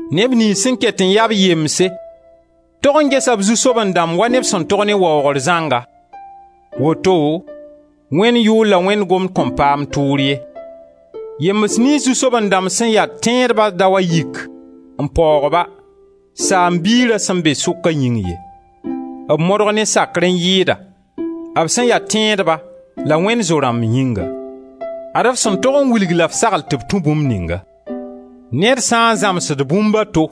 Neb niyns sẽn ket n ya-b yemse tog n gesa b zu-soaben-dãmb wa neb sẽn tog ne waoogr zãnga, woto Wẽnd yʋʋr la Wẽnd gomd kõn paam tʋʋr ye. Yembs niyns zu-soaben-dãmb sẽn ya tẽedba da wa yik n paoog-ba, saam-biira sẽn be sʋka yĩng ye. B modg ne sakr n yɩɩda, b sẽn ya tẽedba la Wẽnd zo-rãmb yĩnga. Zãms yood dãmba Ad-f sẽn tog n wilg la f sagl tɩ b tũ bũmb ninga. Ned sã n zãmsd bũmb a to,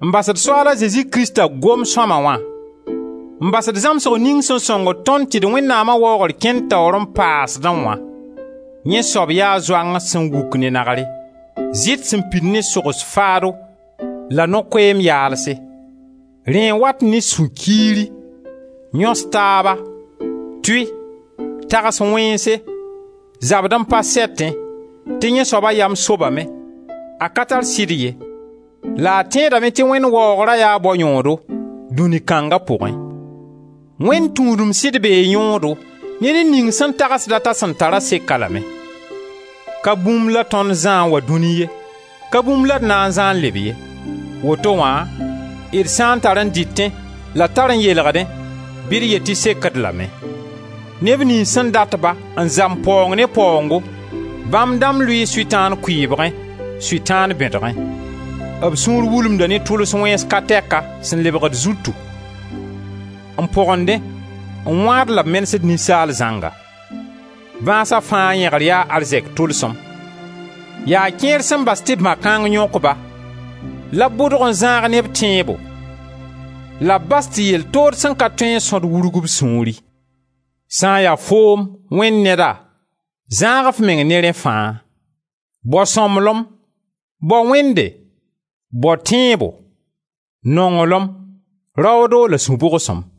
n basd Soaal a Zezi Krista goam sõma wã, n basd zãmsg ning sẽn sõngd tõnd tɩ d Wẽnnaama waoogr kẽnd taoor n paasdẽ wã, yẽ soab yaa zoang sẽn wuk ne nagre, zɩt sẽn pid ne sogs faado la no-koɛɛm yaalse. Rẽ n wat ne sũ-kiiri, yõs-taaba, tʋy, tags wẽnse, zabd-n-pa-sɛtẽ, tɩ yẽ soaba yam sobame, a ka tar sɩd ye la a tẽedame tɩ Wẽnd waoogra yaa bao yõodo dũni kãnga pʋgẽ. Wẽnd tũudem sɩd bee yõodo ne ned ning sẽn tagsd t'a sẽn tar-a sek-a lame. Ka bũmb la tõnd zã n wa dũni ye, ka bũmb la d na n zã n leb ye. Woto wã, d sã n tar n dɩtẽ la d tar n yeelgdẽ bɩ d yet tɩ sek-d lame. Neb niyns sẽn dat-ba n zam paoong ne paoongo, bãmb dãmb lʋɩɩ Sʋtãan kʋɩɩbgẽ, Sʋtãan bẽdgẽ; b sũur wulumda ne tʋls wẽns ka tɛka sẽn lebgd zutu, n pogendẽ, n wãad la b menesd ninsaal zãnga. Bãasa fãa yẽgr yaa arzɛk tʋlsem; yaa kẽer sẽn bas tɩ bã-kãng yõk-ba la b bʋdg n zãag ne b tẽebo la b bas tɩ yell tood sẽn ka tõe n sõd wurg b sũuri. Sã n ya foom, Wẽnd neda, zãag f meng ne rẽ fãa. Bao sõmblem, bao Wẽnde, bao tẽebo, nonglem, raoodo la sũ-bʋgsem.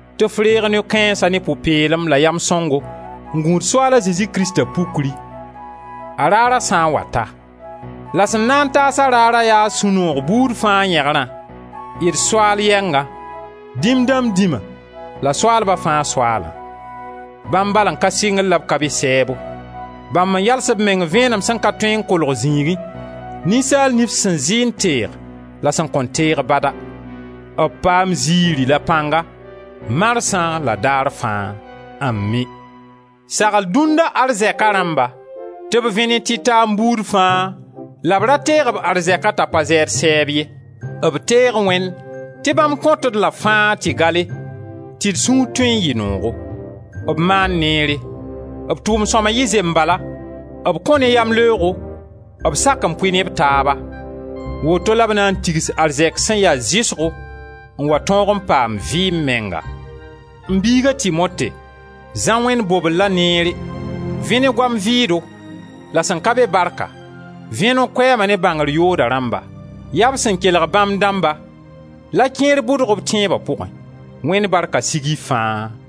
tɩ f reeg noy-kãensa ne pʋ-peelem la yam sõngo n gũud Soaala Zezi Krista pukri, a Raara sã n wa ta; la sẽn na n taas-a Raarã yaa sũ-noog buud fãa yẽgrã, d Soaal yɛngã, dĩm dãmb Dĩma la soaalba fãa Soaalã; bãmb bal n ka sɩngr la b ka be sɛɛbo; bãmb n yals b meng vẽenem sẽn ka tõe n kolg zĩigẽ, ninsaal nif sẽn zɩ n teeg la a sẽn kõn teege bada. B paam ziiri la pãnga, marsã la daar fãa. Ami! Sagl dũnna arzɛka rãmba tɩ b vẽ ne tɩtaam buud fãa la b ra teeg b arzɛka t'a pa zɛɛd sɛɛb ye. B teeg Wẽnd tɩ bãmb kõt-d-la fãa tɩ gale, tɩ d sũur tõe n yɩ noogo. B maan neere; b tʋʋm-sõma yɩ zembala, b kõ ne yamleoogo, b sak n pʋɩ ne b taaba. Woto la b na n tigs arzɛk sẽn ya zɩsgo n wa tõog n paam vɩɩm menga. M biig a Timote, zã Wẽnd bobellã neere. Vẽ ne goam vɩʋʋdo la sẽn ka be barka, vẽ no-koɛɛma ne bãngr yooda rãmba. Yaa b sẽn kelg bãmb dãmba la kẽer bʋdg b tẽeba pʋgẽ. Wẽnd barka sig y fãa!